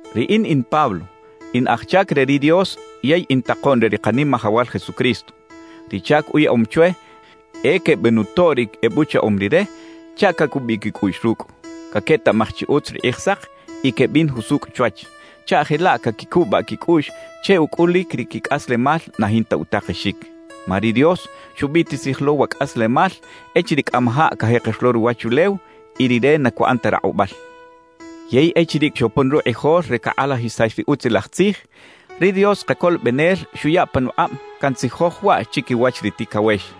Riꞌin in Pablo, in aj chac re ri Dios yey in takoꞌn re ri Kanimajawal Jesucristo. Ri chac uyaꞌom chwe e quebenutoꞌ ri ebuchaꞌom Rire chaꞌ cacubiꞌ quicꞌuꞌx rucꞌ, caquetaꞌmaj chi utz ri Kꞌijsak y quebin jusucꞌ chwach chaꞌ jelaꞌ caquicubaꞌ quicꞌuꞌx che ucꞌulic ri quicꞌaslemal na jinta utakexic. Ma ri Dios xubiꞌtisij lo wa cꞌaslemal echiriꞌ cꞌamajaꞌ cajeker lo ruwachulew, y Rire na cuꞌan ta rakꞌubal. Yey echiriꞌ xopon rukꞌijol re cakꞌalajisax ri Utzilaj Tzij, ri Dios Kacolobenel xuya panukꞌab cantzijoj waꞌ chiquiwach ri ticawex.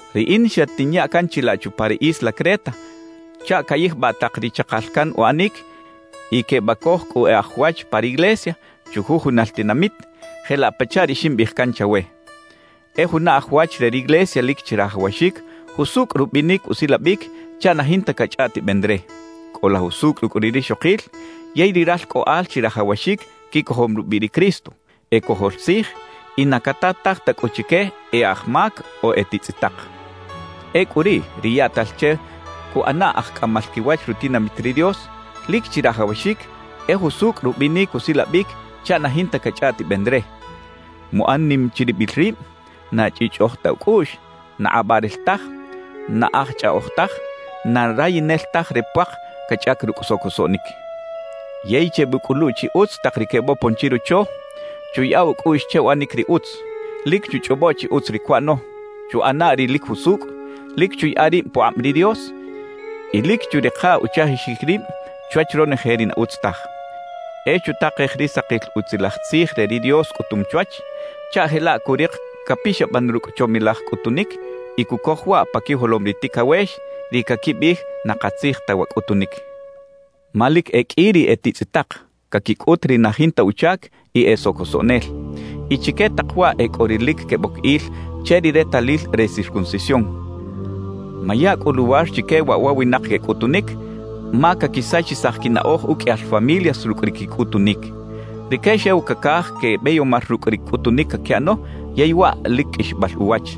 Riꞌin xatinya can chilaꞌ chupa ri isla Creta chaꞌ cayijbaꞌ tak ri chakal can uꞌanic y quebacoj cꞌu e aj wach pa riglesia chujujunal tinamit, jelaꞌ pachaꞌ ri ximbiꞌij can chawe. E juna aj wach re riglesia lic chirajawaxic jusucꞌ rubinic usilabic chaꞌ na jinta cachꞌaꞌtiben re. Cꞌola jusucꞌ rucꞌ ri rixokil yey ri ralcꞌoꞌal chirajawaxic quicojom rubiꞌ ri Cristo, e cojol tzij y na catataj ta cꞌu chique e aj mac o e titzꞌitak. Ecꞌu riꞌ ri yaꞌtal che cuꞌana aj cꞌamal quiwach rutinamit ri Dios, lic chirajawaxic e jusucꞌ rubinic usilabic chaꞌ na jinta cachꞌaꞌtiben re, muꞌan nim chiribil rib, na chꞌiꞌchꞌoj ta ucꞌuꞌx, na kꞌabaꞌrel taj, na aj chꞌaꞌoj taj, na rayinel taj re puak cachꞌac rucꞌ socosoꞌnic. Yey chebucꞌulu chi utz tak ri quebopon chirocho, chuyaꞌa ucꞌuꞌx che uꞌanic ri utz, lic chuchꞌobo chi utz ri cuꞌano, chuꞌana ri lic jusucꞌ, lic chuyaꞌa rib pukꞌab ri Dios y lic churika uchajixic rib chwach ronoje ri na utz taj. E chutakej ri sakil Utzilaj Tzij re ri Dios cꞌutum chwach chaꞌ jelaꞌ curik capixaban rucꞌ chomilaj cꞌutunic y cucoj waꞌ pa quijolom ri ticawex, ri caquibiꞌij na katzij ta wa cꞌutunic. Ma lic e qꞌui ri e titzꞌitak, caquicꞌut ri na jinta uchac y e socosoꞌnel. Y chique tak waꞌ e cꞌo ri lic queboc il che ri retalil re circuncisión. Maya cꞌu luwar chique waꞌ wa winak quecꞌutunic, ma caquisachisaj quinaꞌoj uqꞌuiyal familias rucꞌ ri quicꞌutunic. Rique xew cacaj quebeyomar rucꞌ ri cꞌutunic caquiꞌano yey waꞌ lic qꞌuixbal uwach.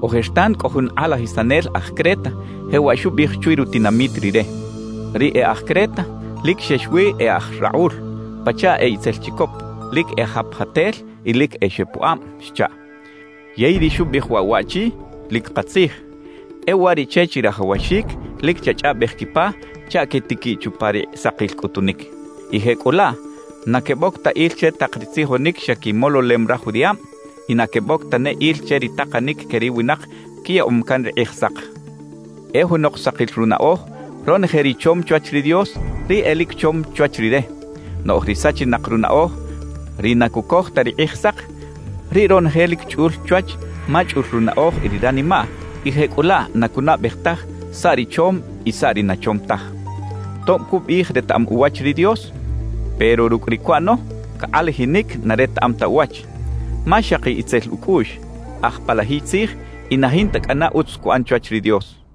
Ojertan cꞌo jun kꞌalajisanel aj Creta, jewaꞌ xubiꞌij chwi rutinamit rire: “Ri e aj Creta lic xex wi e aj rakꞌul, pachaꞌ e itzel chicop, lic e japjatel y lic e xepuꞌab” xchaꞌ. Yey ri xubiꞌij waꞌ waꞌchi lic katzij; e uwariꞌche chirajawaxic lic chachꞌaꞌbej quipa chaꞌ quetiquiꞌ chupa ri sakil cꞌutunic, y jecꞌulaꞌ na queboc ta il che tak ri tzijonic xa quimololem raj judiꞌab y na queboc tane il che ri takanic que ri winak quiyaꞌom can ri Kꞌijsak. E junok sakil runaꞌoj, ronoje ri chom chwach ri Dios, riꞌ e lic chom chwach rire. Noꞌj ri sachinak runaꞌoj, ri na cucoj ta ri Kꞌijsak, riꞌ ronoje lic chꞌul chwach ma chꞌul runaꞌoj y ri ranimaꞌ; y jecꞌulaꞌ na cunaꞌbej taj saꞌ ri chom y saꞌ ri na chom taj. Tob cubiꞌij retaꞌam uwach ri Dios; pero rucꞌ ri cuꞌano, cakꞌalajinic na retaꞌam ta uwach. Ma xaki itzel ucꞌuꞌx, aj palajiy tzij y na jinta cꞌana utz cuꞌan chwach ri Dios.